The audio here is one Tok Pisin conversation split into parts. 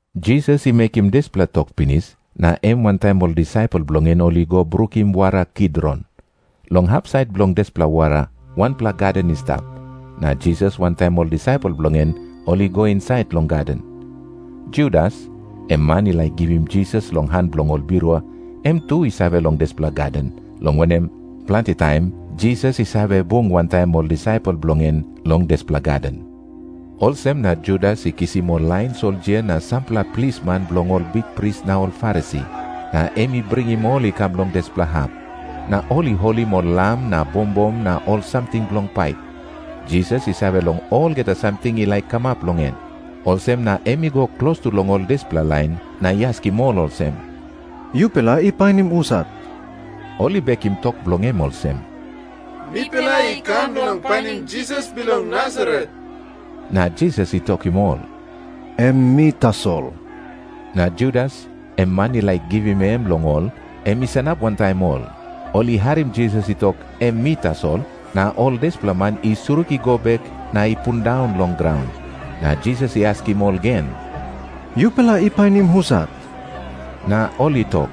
Jisas i mekim dispela tok pinis, na em wantaim ol disaipel bilong en ol i go brukim wara Kidron. Long hapsait bilong dispela wara wanpela gaden i stap, na Jisas wantaim ol disaipel bilong en ol i go insait long gaden. Judas, em man i laik givim Jisas long han bilong ol birua, em tu i save long dispela gaden, long wanem, planti taim Jisas i save bung wantaim ol disaipel bilong en long dispela gaden. Olsem na Judas i kisim ol lain soldia na sampela plisman bilong ol bikpris na ol Farisi, na em i bringim ol i kam long dispela hap. Na ol i holim ol lam na bombom na ol samting bilong pait. Jisas i save long olgeta samting i laik kamap long en. Olsem na em i go klostu long ol dispela lain na i askim ol olsem, “Yupela i painim husat?” Ol i bekim tok bilong em olsem, “Mipela i kam bilong painim Jisas bilong Nasaret.” Na Jisas i tokim ol, “Em mi tasol.” Na Judas, em man i laik givim em long ol, em i sanap wantaim ol. Ol i harim Jisas i tok, “Em mi tasol,” na ol dispela man i surik i go bek na i pundaun long graun. Na Jisas i askim ol gen, “Yupela i painim husat?” Na ol i tok,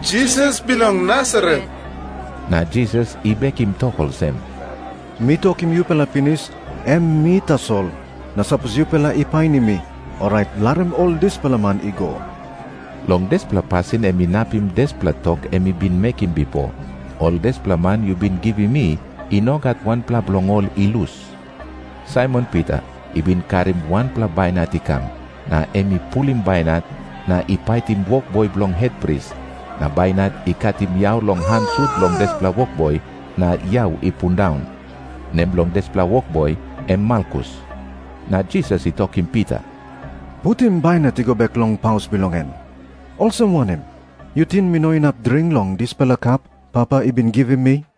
“Jisas bilong Nasaret.” Na Jisas i bekim tok olsem, “Mi tokim yupela pinis, em mi tasol. Na sapos yupela i painim mi, orait larim ol dispela man i go.” Long dispela pasin em inapim dispela tok em i bin mekim bipo, “Ol dispela man yu bin givim mi, i no gat wanpela bilong ol i lus.” Saimon Pita i bin karim wanpela bainat i kam, na em i pulim bainat na i paitim wokboi bilong hetpris, na bainat i katim yau long han sut bilong dispela wokboi na yau i pundaun. Nem bilong dispela wokboi em Malkus. Na Jisas i tokim Pita, “Putim bainat i go bek long paus bilong en. Olsem wanem? Yu ting mi no inap dring long dispela kap Papa i bin givim mi?”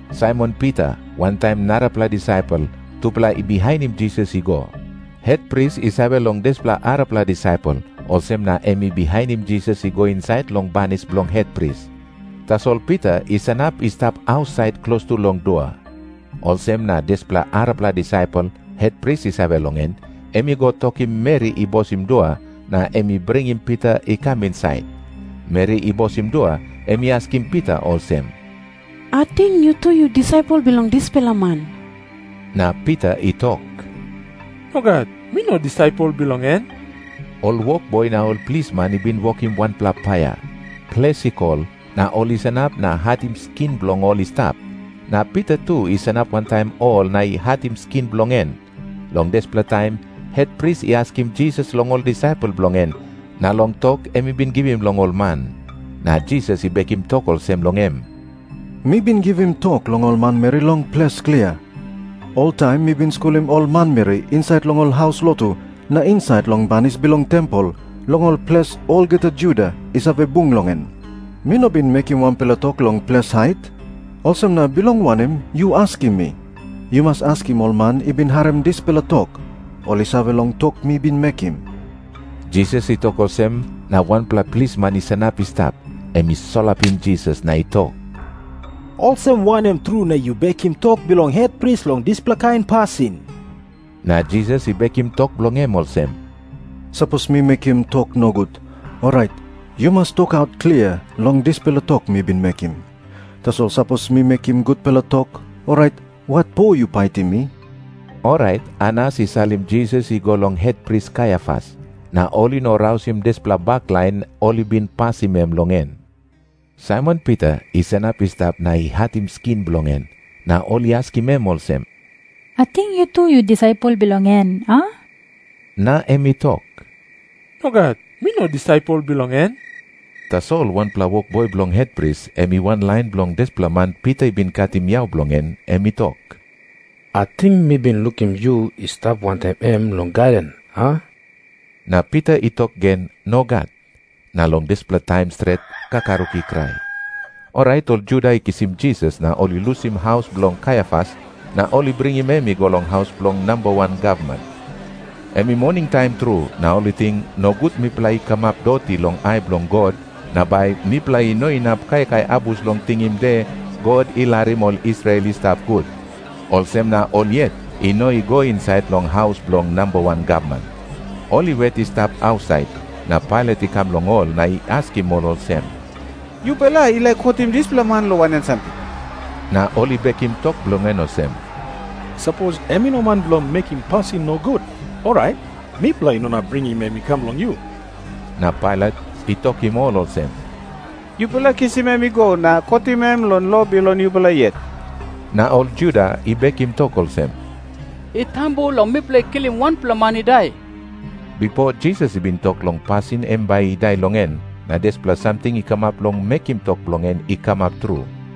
Saimon Pita wantaim narapela disaipel, tupela i bihainim Jisas i go. Hetpris i save long dispela arapela disaipel, olsem na em i bihainim Jisas i go insait long banis bilong hetpris. Tasol Pita i sanap i stap ausait klostu long dua. Olsem na dispela arapela disaipel, hetpris i save long en, em i go tokim meri i bosim dua, na em i bringim Pita i kam insait. Meri i bosim dua, em i askim Pita olsem, “Ating yu tu yu disaipel bilong dispela man?” Na Pita i tok, “Nogat. Mi no disaipel bilong en.” Ol wokboi na ol plisman i bin wokim wanpela paia. Ples i kol, na ol i sanap na hatim skin bilong ol i stap. Na Pita tu i sanap wantaim ol na i hatim skin bilong en. Long dispela taim hetpris i askim Jisas long ol disaipel bilong en, na long tok em i bin givim long ol man. Na Jisas i bekim tok olsem long em, “Mi bin givim tok long ol manmeri long ples klia. Oltaim mi bin skulim ol manmeri insait long ol haus lotu na insait long banis bilong tempel, long ol ples olgeta Juda i save bung long en. Mi no bin mekim wanpela tok long ples hait. Olsem na bilong wanem yu askim mi? Yu mas askim ol man i bin harim dispela tok. Ol i save long tok mi bin mekim.” Jisas i tok olsem na wanpela plisman i sanap i stap, em i solapim Jisas na i tok, “Olsem wanem tru na yu bekim tok bilong hetpris long dispela kain pasin?” Na Jisas i bekim tok bilong em olsem, “Sapos mi mekim tok nogut, orait yu mas tokaut klia long dispela tok mi bin mekim. Tasol sapos mi mekim gutpela tok, orait watpo yu paitim mi?” Orait Anas i salim Jisas i go long hetpris Kaiafas. Na ol i no rausim dispela baklain ol i bin pasim em long en. Saimon Pita i sanap i stap na i hatim skin bilong en. Na ol i askim em olsem, “Ating yu tu yu disaipel bilong en, a?” Na em i tok, “Nogat. Mi no disaipel bilong en.” Tasol wanpela wokboi bilong hetpris, em i wanlain bilong dispela man Pita i bin katim yau bilong en, em i tok, “Ating mi bin lukim yu i stap wantaim em long gaden, a?” Na Pita i tok gen, “Nogat.” Na long dispela taim stret, kakaruk i krai. Orait ol Juda i kisim Jisas na ol i lusim haus bilong Kaiafas na ol i bringim em i go long haus bilong namba wan gavman. Em i moningtaim tru. Na ol i ting, “Nogut mipela i kamap doti long ai bilong God na bai mipela i no inap kaikai abus bilong tingim De God I Larim Ol Israel I Stap Gut,” olsem na ol yet i no i go insait long haus bilong namba wan gavman. Ol i wet i stap ausait, na Pailat i kam long ol na i askim ol olsem, “Yupela i laik kotim dispela man long wanem samting?” Na ol i bekim tok bilong en olsem, “Sapos em i no man bilong mekim pasin nogut, orait mipela i no inap bringim em i kam long yu.” Na Pailat i tokim ol olsem, “Yupela kisim em i go na kotim em long lo bilong yupela yet.” Na ol Juda i bekim tok olsem, “I tambu long mipela i kilim wanpela man i dai.” Bipo Jisas i bin tok long pasin em bai i dai long en, na dispela samting i kamap bilong mekim tok bilong en i kamap tru.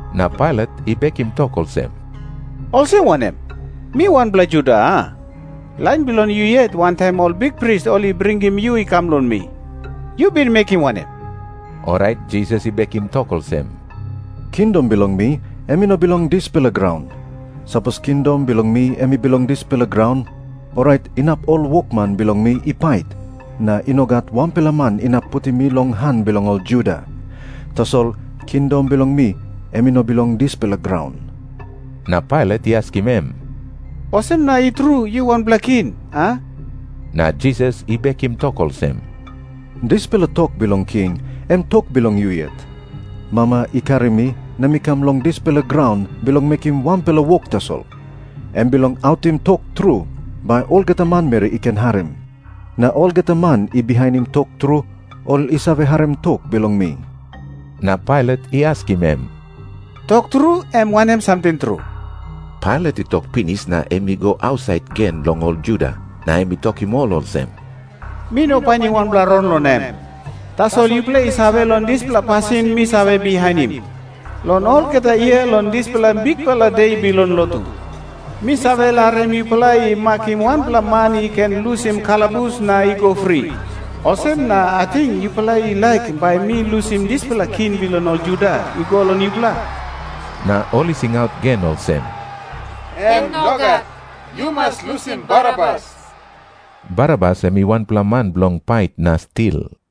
Na Pailat i bekim tok olsem, “Olsem wanem? Mi wanpela Juda, a? Lain bilong yu yet wantaim ol bikpris ol i bringim yu i kam long mi. Yu bin mekim wanem?” Orait Jisas i bekim tok olsem, “Kingdom bilong mi em i no bilong dispela graun. Sapos kingdom bilong mi em i bilong dispela graun, orait inap ol wokman bilong mi i pait, na i no gat wanpela man inap putim mi long han bilong ol Juda. Tasol kingdom bilong mi em i no bilong dispela graun.” Na Pailat i askim em, “Olsem na i tru yu wanpela king, a?” Na Jisas i bekim tok olsem, “Dispela tok bilong king, em tok bilong yu yet. Mama i karim mi na mi kam long dispela graun bilong mekim wanpela wok tasol, em bilong autim tok tru, bai olgeta manmeri i ken harim. Na olgeta man i bihainim tok tru, ol i save harim tok bilong mi.” Na Pailat i askim em, “Tok tru, em wanem samting tru?” Pailat i tok pinis na em i go ausait gen long ol Juda. Na em i tokim ol olsem, “Mi no painim wanpela rong long em. Tasol yupela i save long dispela pasin mi save bihainim. Long olgeta yia long dispela bikpela de bilong lotu, mi save larim yupela i makim wanpela man i ken lusim kalabus na i go fri. Olsem na ating yupela i laik bai mi lusim dispela king bilong ol Juda i go long yupela?” Na ol i singaut gen olsem, “Em nogat. Yu mas lusim Barabas.” Barabas em i wanpela man bilong pait na stil.